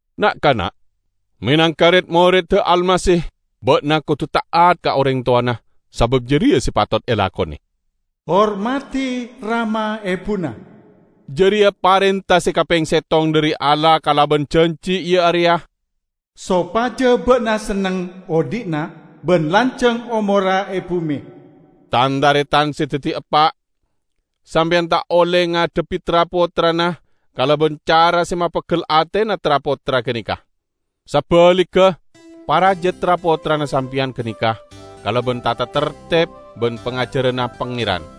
Na'-kana'! Menangka red-moredda Almasih, ba'na kodu ta'at ka oreng towana sabab jareya se patot elakone. "Hormadi rama ebuna", jareya parenta se kapeng settong dhari Allah kalaban janji, iya areya: "Sopaja ba'na senneng odhi'na ban lanjang omorra e bume". Tan-taretan se daddi eppa'! Sampeyan ta' olle ngadhebbi tra-pottrana kalaban cara se mapeggel atena tra-pottra ganeka. Sabaligga, paraja tra-pottrana sampeyan ganeka kalaban tata tarteb ban pangajaranna Pangeran.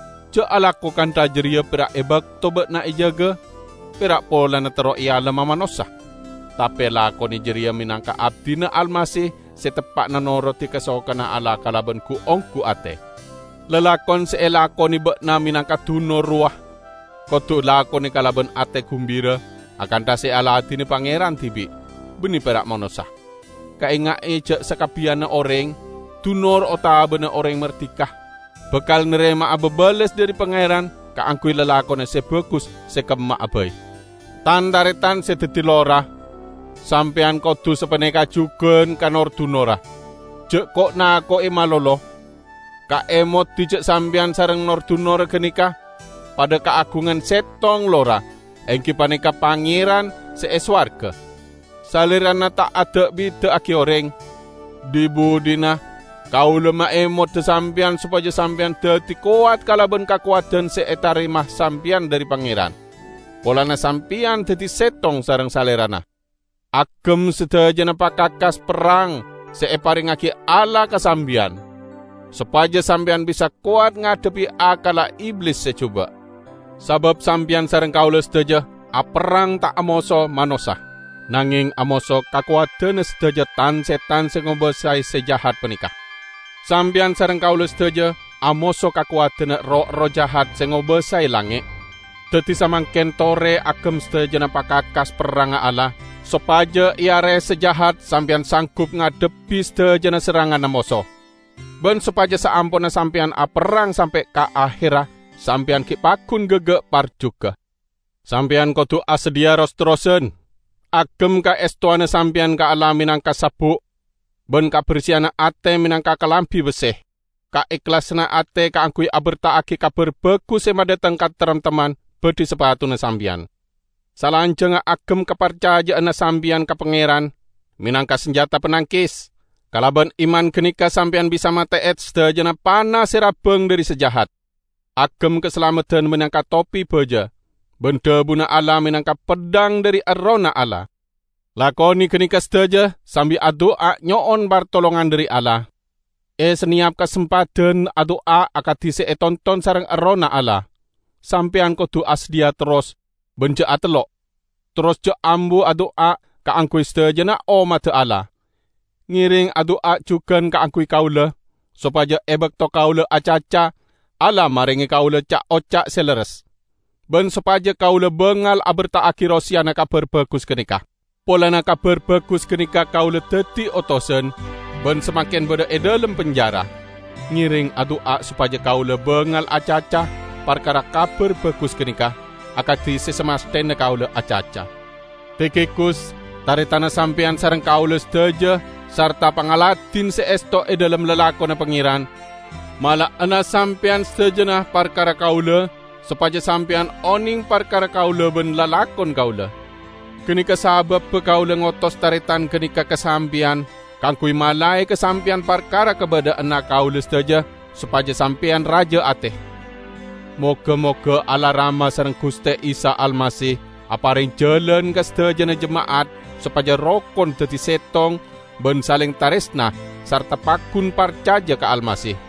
Ja' alako kantha jareya pera' e bakto ba'na ejaga, pera' polana terro ealemma manossa. Tape lakone jareya menangka abdina Almasih se teppa'na norodi kasokanna Allah kalaban gu-onggu ate! Lalakon se elakone ba'na menangka dunor rowa kodu lakone kalaban ate gumbira akantha se aladine Pangeran dibi', banne pera' manossa. Kaenga'e ja' sakabbiyanna oreng, dunor otaba oreng mardika, bakal narema'a babales dhari Pangeran kaangguy lalakonna se bagus se kemma'a bai. Tan-taretan se daddi lora! Sampeyan kodu sapaneka jugan ka nor-dunorra. Ja' ko'-nako'e malolo. Kaemodi ja' sampeyan sareng nor-dunorra ganeka padha kaagungan settong lora, enggi paneka Pangeran se e sowarga. Salerana ta' ada'-bida'agi oreng. Dhi-budhina, kaula maemoda sampeyan sopaja sampeyan daddi kowat kalaban kakowadan se etarema sampeyan dhari Pangeran, polana sampeyan daddi settong sareng Salerana. Agem sadajana pakakas perrang se eparengngagi Allah ka sampeyan, sopaja sampeyan bisa kowat ngadhebbi akkalla Iblis se juba'. Sabab sampeyan sareng kaula sadaja aperrang ta' amoso manossa, nangeng amoso kakowadanna sadaja tan-setan se ngobasae se jahat paneka. Sampeyan sareng kaula sadaja amoso kakowadanna roh-erroh jahat se ngobasae langnge'. Daddi, samangken tore agem sadajana pakakas perrangnga Allah, sopaja e are se jahat sampeyan sanggup ngadhebbi sadajana serranganna moso. Ban sopaja saamponna sampeyan aperrang sampe' ka aherra, sampeyan gi' paggun gaga' parjuga. Sampeyan kodu asadhiya ros-terrosan. Agem kaestowanna sampeyan ka Allah menangka sabbu', ban kaberseyanna ate menangka kalambi besse. Kaehlasanna ate kaangguy aberta'agi Kabar Bagus se madhateng kataremtemman badhi sapatuna sampeyan. Salanjangnga agem kaparcaja'anna sampeyan ka Pangeran menangka sanjata panangkes; kalaban iman ganeka sampeyan bisa mate'e sadajana pana se rabbang dhari se jahat. Agem kasalameddan menangka topi baja, ban dhabuna Allah menangka peddhang dhari Errohna Allah. Lakone ganeka sadaja sambi adu'a nyo'on partolongan dhari Allah. E saneyap kasempadan, adu'a akadi se etonton sareng Errohna Allah. Sampeyan kodu asadhiya terros ban ja' atellok. Terros ja' ambu adu'a kaangguy sadajana ommadda Allah. Ngereng adu'a jugan kaangguy kaula, sopaja e bakto kaula acaca, Allah marenge kaula ca'-oca' se lerres. Ban sopaja kaula bangal aberta'agi roseyana Kabar Bagus ganeka. Polana Kabar Bagus ganeka kaula daddi otosan, ban samangken badha e dhalem penjara. Ngereng adu'a sopaja kaula bangal acaca parkara Kabar Bagus ganeka, akadi se samasthena kaula acaca. Tikhikus, taretanna sampeyan sareng kaula sadaja sarta pangladin se esto e dhalem lalakonna Pangeran, mala'ana sampeyan sadajana parkara kaula, sopaja sampeyan oneng parkara kaula ban lalakon kaula. Ganeka sababba kaula ngotos taretan ganeka ka sampeyan kaangguy malae ka sampeyan parkara kabadha'anna kaula sadaja, sopaja sampeyan raja ate. Moga-moga Allah Rama sareng Guste Isa Almasih apareng jalan ka sadajana jema'at sopaja rokon daddi settong ban saleng taresna sarta paggun parcaja ka Almasih.